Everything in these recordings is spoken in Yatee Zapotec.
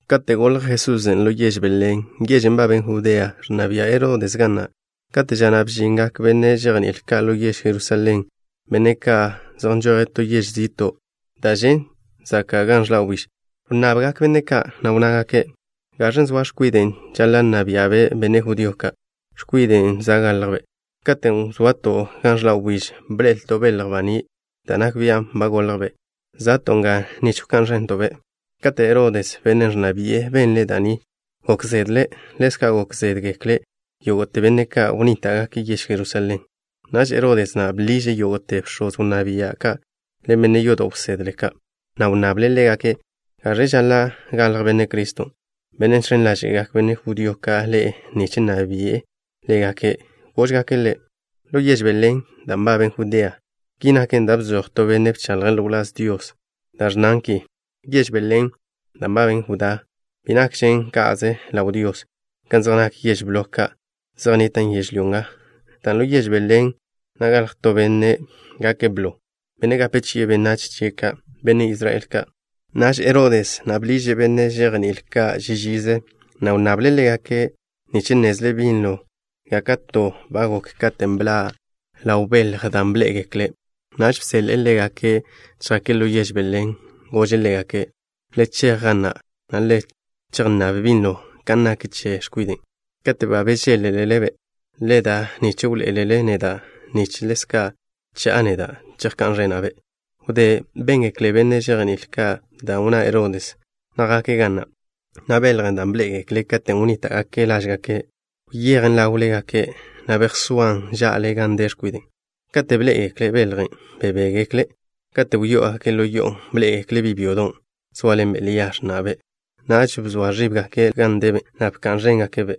Kate' golj Jesusen' ḻo yež Belén, yežen' nbaben Judea, ẕnna bia' Herodes ga na'. Kate' ža na' bžingak benne' žejní'il ka' ḻo yež Jerusalén, benne' ka' zej nžoje' to yež zi'to' da' žen' zaka' gan ẕḻa' wbíž. Wnnabgak benne' ka', na' wnnágake': —¿Gaẕen' zoa x̱kwiden' žaḻa' nna bia'be' benne' judío ka', x̱kwiden' za' goljbe'? Katen' wzoato' gan ẕḻa' wbíž bḻe'elto' belj baní' da' nak bian' ba goljbe'. Za'to' nga nich wká'n ẕento'-be'. Kate' Herodes, bennen' ẕnna bi'e, benle' da' ni, gok zedle'. Ḻezca' gok zédgekle yógo'te benne' ka' wnníta'gake' yež Jerusalén. Naž Herodes na' bḻiže' yógo'te bx̱oz wnná bia' ka' ḻen benne' yodo' wsedle ka', na' wnnable' ḻégake' gaẕe žaḻa' galj Benne' Criston', Bennen' žx̱en ḻáže'gak benne' judío ka' ḻe'e nich nna bi'e ḻégake'. Góžgake' ḻe': —Ḻo yež Belén, da' nbaben Judea. Ki naken dan' bzoj to benne' bchaḻje' ḻo wláz Dios da' ẕnnan ki: Yež Belén, da' nbaben Judá, bi nakžen ka'ze ḻaw Dios, ka zej nak yež blo ka' zej nnitan' yežlyó nga, dan' ḻo yež Belén na' galj to Benne' gake' blo, Bennen' gape chi'e benách chia' ka', benne' Israel ka'. Naž Herodes na' bḻiže' benne' žejní'il ka' ži žize, na' wnnable' ḻégake' nich nnezle' binlo gáka'te ba gok katen' bḻa' ḻaw beljen' da' bḻé'egekle'. Naž bseḻe'e ḻégake' chjake' ḻo yež Belén. Gože' ḻégake': —Le chej ga na', na' le chejnnáb binlo kan nak che x̱kwiden'. Kate' ba bežéḻ-lele-be', le da nich wḻoé'elele neda', nich ḻezka' cha'a neda', chejká'n ẕena'-be'. Wdé béngekle benne' žejní'il ka' dan' wnná Herodes na', jake' ga na', na' beljen' da' bḻé'egekle' katen' wnníta'gake' lážgake', wyejen ḻáwlegake', na' bejsóan ža'le gan de x̱kwiden'. Kate' bḻé'egekle' beljen', bebéḻe'egekle'. Kate' wyó'ogake' ḻo yo'on', bḻé'egekle' bi' byodon', zóaḻenbe' Lia, x̱na'be'. Naž bzoa ẕíbgake' ḻawle gan debe', na' bka'n ẕéngake'-be'.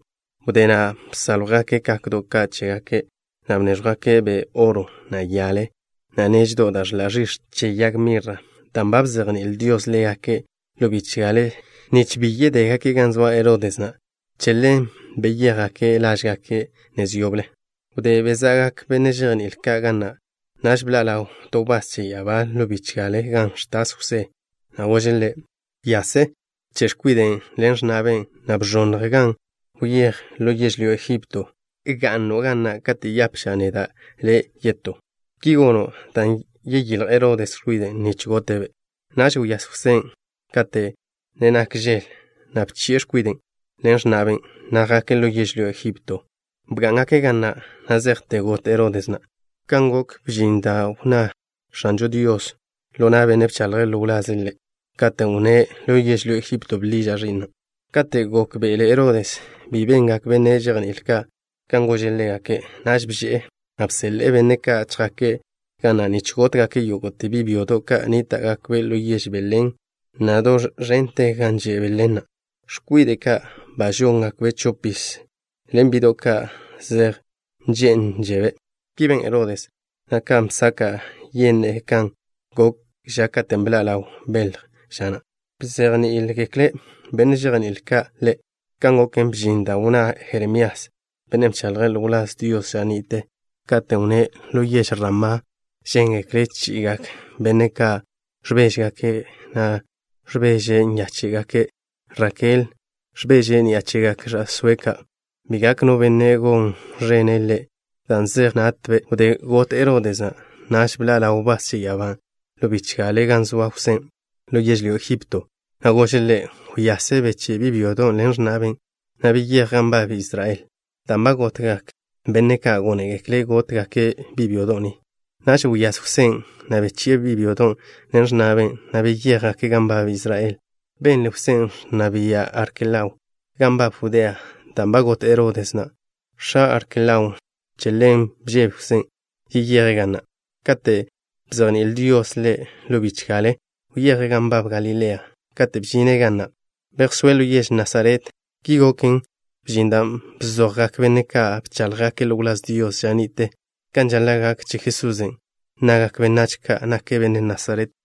Wdé na' bsáljwgake' kakdo' ka' chégake', na' bnéẕjwgake'-be' oro, na' yale, na' neždo' da' ẕḻa' ẕix̱ che yag mirra. Dan' ba bzejní'il Dios ḻégake' ḻo bichgale nich bi yeyéjgake' gan zoa Herodes na', che ḻen beyéjgake' lážgake' nez yoble. Wdé beza'gak benne' žejní'il ka' ga na', naž bḻa' ḻaw to wbás che ya'abá ḻo bichgale gan ẕtas Jwsé, na' gože' ḻe': —Wyase. Bche' x̱kwiden' ḻen x̱na'be', na' bẕonnj nga. Wyéj ḻo yežlyó Egipto. Ga'no' ga na' kate' yapža' neda' le' yetó. Ki gono' dan' yeyílj Herodes x̱kwide' ni nich gote'-be'. Naž wyase Jwsén', kate' ne nak žel, na' bchi'e x̱kwiden' ḻen x̱na'be', na' jake' ḻo yežlyó Egipto. Bgá'ngake' ga na' na' zejte got Herodes na'. Ka' goken, bžin da' wnná X̱anžo Dios ḻo na' benne' bchaḻje' ḻo wlaze' Ḻe', katen' wnné': “Ḻo yežlyó Egipto bḻiža' Ẕi'na'.” Kate' gókbe'ele Herodes bi bengak benne' žejní'il ka' kan gože' ḻégake', naž bže'e, na' bseḻe'e benne' ka' chjake' ga na' nich gótgake' yógo'te bi' byodo' ka' nníta'gakbe' ḻo yež Belén, na' do ẕente gan že' Belén na', x̱kwide' ka' ba žóngakbe' chopiz, ḻen bi'do' ka' zej nžé'nžebe'. Ki ben Herodes na' kan bsaka' yenne'e, kan gok ža katen' bḻa' ḻaw beljen', ža na' bzejní'igekle benne' žejní'il ka' ḻe'. Ka' goken, bžin da' wnná Jeremías, bennen' bchaḻje' ḻo wláz Dios ža ni'te, katen' wnné': Ḻo yež Ramá žéngekle chi'igak benne' ka' ẕbéžegake', na' ẕbeže nyáche'gake'. Rakel ẕbeže' ni'a chegak ẕa'sóe' ka'. Bi gak no benne' gon ẕene' ḻe', dan' zej natbe'. Wdé got Herodes na', naž bḻa' ḻaw wbás che ya'abán' ḻo bichgale gan zoa Jwsén' ḻo yežlyó Egipto, na' gože' ḻe': —Wyase. Beché' bi' byodon' ḻen x̱na'be', na' beyéj gan nbab Israel, dan' ba gotgak benne' ka' gónegekle' gótgake' bi' byodo' ni. Naž wyase Jwsén', na' bechi'e bi' byodon' ḻen x̱na'be', na' beyéjgake' gan nbab Israel. Benle Jwsén' ẕnna bia' Arkelao gan nbab Judea dan' ba got Herodes na', x̱a Arkelaon'. Che ḻen bžebe Jwsén' yeyeje' ga na'. Kate' bzejní'il Dios ḻe' ḻo bichgale, wyeje' gan nbab Galilea. Kate' bžine' ga na', bejsóe' ḻo yež Nasaret. Ki goken, bžin da' bzojgak benne' ka' bcháḻjgake' ḻo wláz Dios ža ni'te kan žaḻa' gak che Jesusen', nnagak benách ka' nake' Benne' Nasaret.